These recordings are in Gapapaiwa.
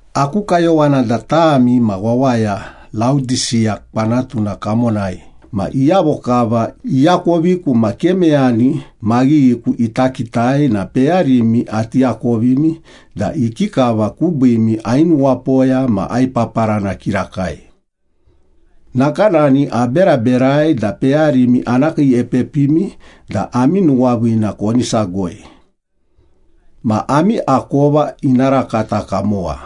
Aku kayowana da tami ma wawaya Laodisiya kwanatuna kamonai ma iyavo kava iakoviku ma ke meyani maghighiku ita kitai na peyarimi ati akovimi da ikikava kubiimi ainuwapoya ma aipaparana kirakai. Nakanani aberaberai da peyarimi ana kiiepepimi da ami nuwaviina koni sagoi. Ma ami akova ina rakata kamowa,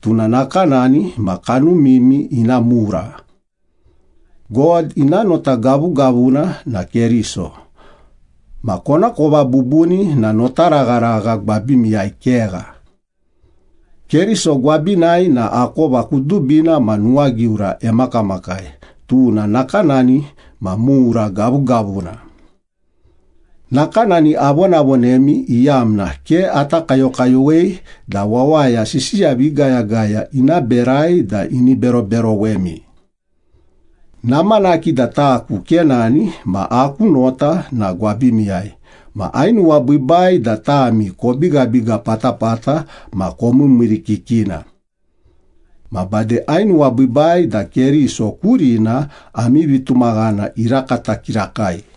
tuna nakanani ma kanumimi ina mura. God ina nota gavugavuna na Keriso, ma konakova bubuni na notaragharagha gwabimiyai kegha. Keriso gwabinai na akova kudubina ma nuwagiura emakamakai, tuna nakanani ma mura gavugavuna. Nakanani avonavonemi iyamna ke ata kayokayowei da wawaya sisiya vigayagaya ina berai da ini beroberowemi. Namanaki da taku ke nani ma aku nota na gwabimiyai, ma ainuwabiibai da tami kobigabiga patapata ma komiimiirikikina. Ma bade ainuwabiibai da Keriso kurina ami vitumaghana irakata kirakai.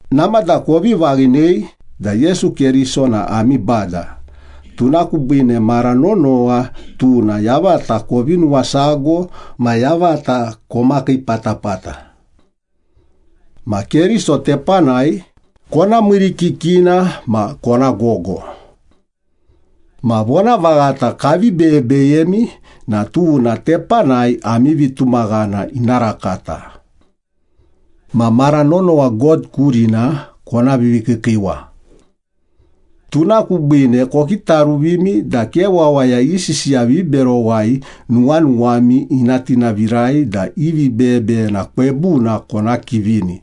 Namada kovi vaghinei da Yesu Keriso na ami Bada, tuna kubiine mara nonowa tuna yavata kovi nuwasago ma yavata komakii patapata. Ma Keriso tepanai kona miirikikina ma kona gogo. Ma vonavaghata kavi beyebeyemi na tuna tepanai ami vitumaghana ina rakata. Ma mara nonowa God kurina kona vivikiikiiwa. Tuna kubiine kokitaruvimi da ke wawaya i sisiya viberowai nuwanuwami ina tinavirai da i vibeyebeyena kwebuna kona kivini.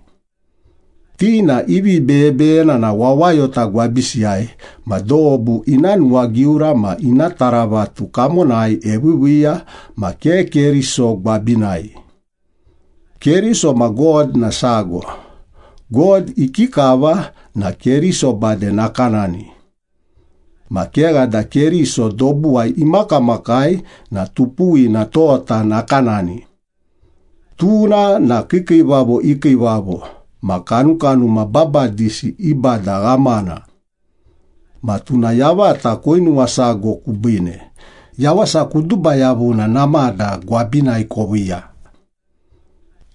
Ti na i vibeyebeyena na wawayota gwabisiyai ma dobu ina nuwagiura ma ina taravatu kamonai eviiviiya ma ke Keriso gwabinai. Keriso ma God na sago. God ikikava na Keriso bade nakanani. Ma kegha da Keriso dobuwai imakamakai na tupuwina tota nakanani. Tuna na kiikiivavo i kiivavo ma kanukanuma babadisi i bada ghamana. Ma tuna yavata koinuwasago kubiine, yawasa kuduba yavuna namada gwabinai koviiya.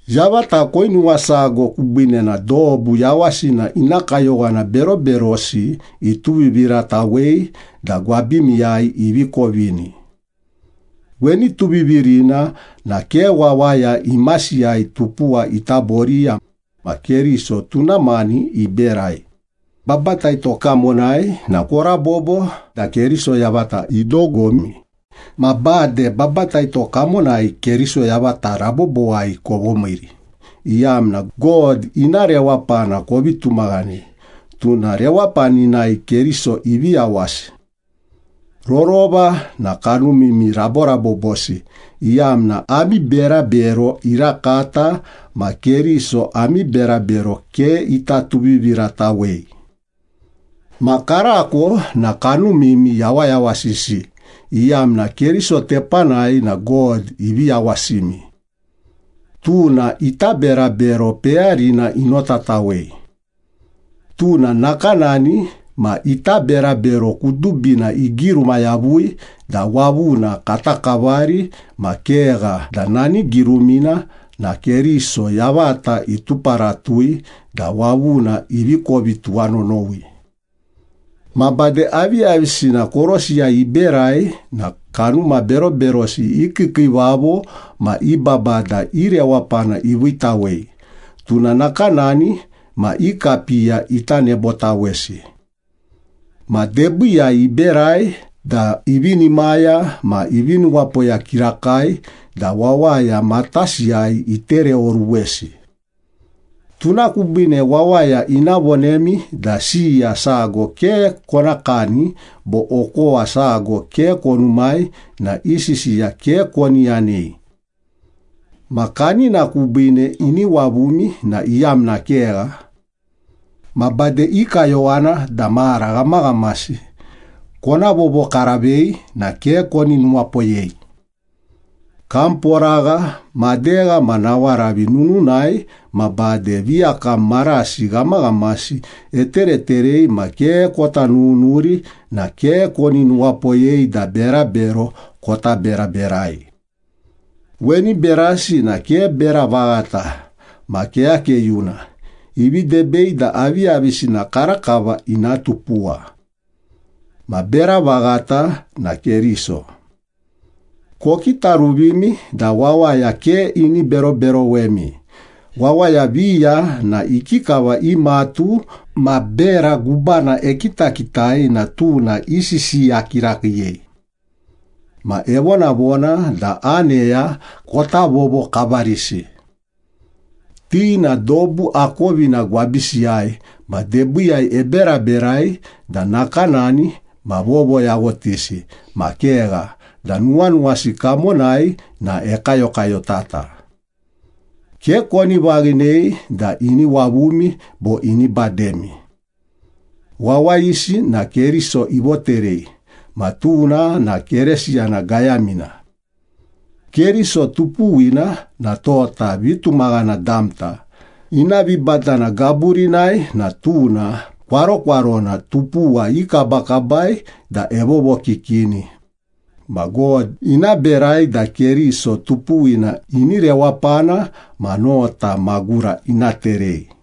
Yavata koinuwasago kubiine na dobu yawasina ina kayowana beroberosi ituviviratawei da gwabimiyai ivi kovini. Weni tuvivirina na ke wawaya imasiyai tupuwa ita boriya ma Keriso tuna mani iberai. Babataito kamonai na korabobo da Keriso yavata idogomi. Ma bade babataito kamonai Keriso yavata rabobowai kovomiiri, iyamna God ina rewapana kovi tumaghanei, tuna rewapaninai Keriso ivi yawasi. Rorova na kanumimi raborabobosi iyamna ami berabero irakata ma Keriso ami berabero ke ita tuviviratawei. Ma karako na kanumimi yawayawasisi iyamna Keriso tepanai na God ivi yawasimi. Tuna ita berabero peyarina inotatawei. Tuna nakanani ma ita berabero kudubina igiruma yavui da wavuna kata kavari ma kegha da nani girumina na Keriso yavata ituparatui da wavuna ivi kovi tuwanonowi. Ma bade aviyavisina korosiyai iberai na kanuma beroberosi i kiikiivavo ma i babada i rewapana iviitawei, tuna nakanani ma i kapiya ita nebotawesi. Ma debiiyai iberai da ivinimaya ma ivi nuwapoya kirakai da wawaya matasiyai itereoruwesi. Tuna kubiine wawaya ina vonemi da siya sago ke kona kani bo okowa sago ke konumai na i sisiya ke koni yanei. Ma kanina kubiine ini wavumi na iyamna kegha. Ma bade i kayowana da mara ghamaghamasi kona vovokaravei na ke koni nuwapoyei. Kamporagha madegha ma nawaravi nununai ma bade viyakam marasi ghamaghamasi etereterei ma ke kota nununuri na ke koni nuwapoya da berabero kota beraberai. Weni berasi na ke bera vaghata ma keyakeyuna, ivi debei da aviyavisina karakava ina tupuwa. Ma bera vaghata na Keriso. Kokitaruvimi da wawaya ke ini beroberowemi, wawaya viya na ikikava imatu ma bera gubana ekitakitai na tuna isisiya kirakiiyei. Ma evonavona da aneya kota vovokavarisi. Ti na dobu akovina gwabisiyai ma debiiyai eberaberai da nakanani ma vovoyaghotisi ma kegha da nuwanuwasi kamonai na ekayokayotata. Ke koni vaghinei da ini wavumi bo ini bademi. Wawayisi na Keriso ivoterei, ma tuna na Keresiyana gayamina. Keriso tupuwina na tota vitumaghana damta, ina vibadana gaburinai na tuna kwarokwarona tupuwa ikabakabai da evovokikini. Ma God ina berai da Keriso tupuwina ini rewapana ma nota magura ina terei.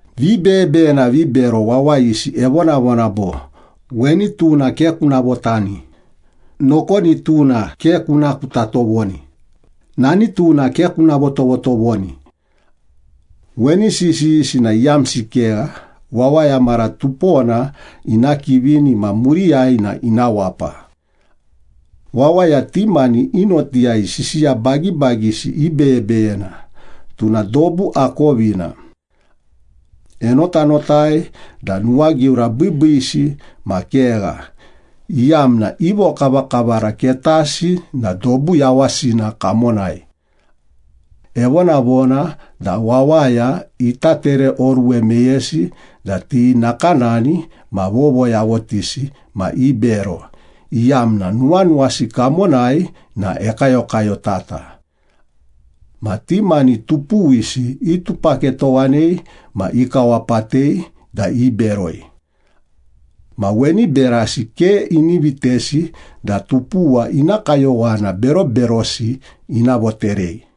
Vibeyebeyena vibero wawayisi evonavona bo, “Weni tuna ke kuna votani,” “Nokoni tuna ke kuna kuta tovoni,” “Nani tuna ke kuna votovotovoni.” Weni sisiyisi na iyamsi kegha, wawaya mara tupona ina kivini ma muriyai na ina wapa. Wawaya ti mani i notiyai sisiya bagibagisi ibeyebeyena, tuna dobu akovina. Enotanotai da nuwagiura biibiisi ma kegha, iyamna i vokavakavara ketasi na dobu yawasina kamonai. Evonavona da wawaya ita tereoruwe meyesi da ti nakanani ma vovoyaghotisi ma ibero, iyamna nuwanuwasi kamonai na ekayokayotata. Ma ti mani tupuwisi itupaketowanei ma ikawapatei da iberoi. Ma weni berasi ke ini vitesi da tupuwa ina kayowana beroberosi ina voterei.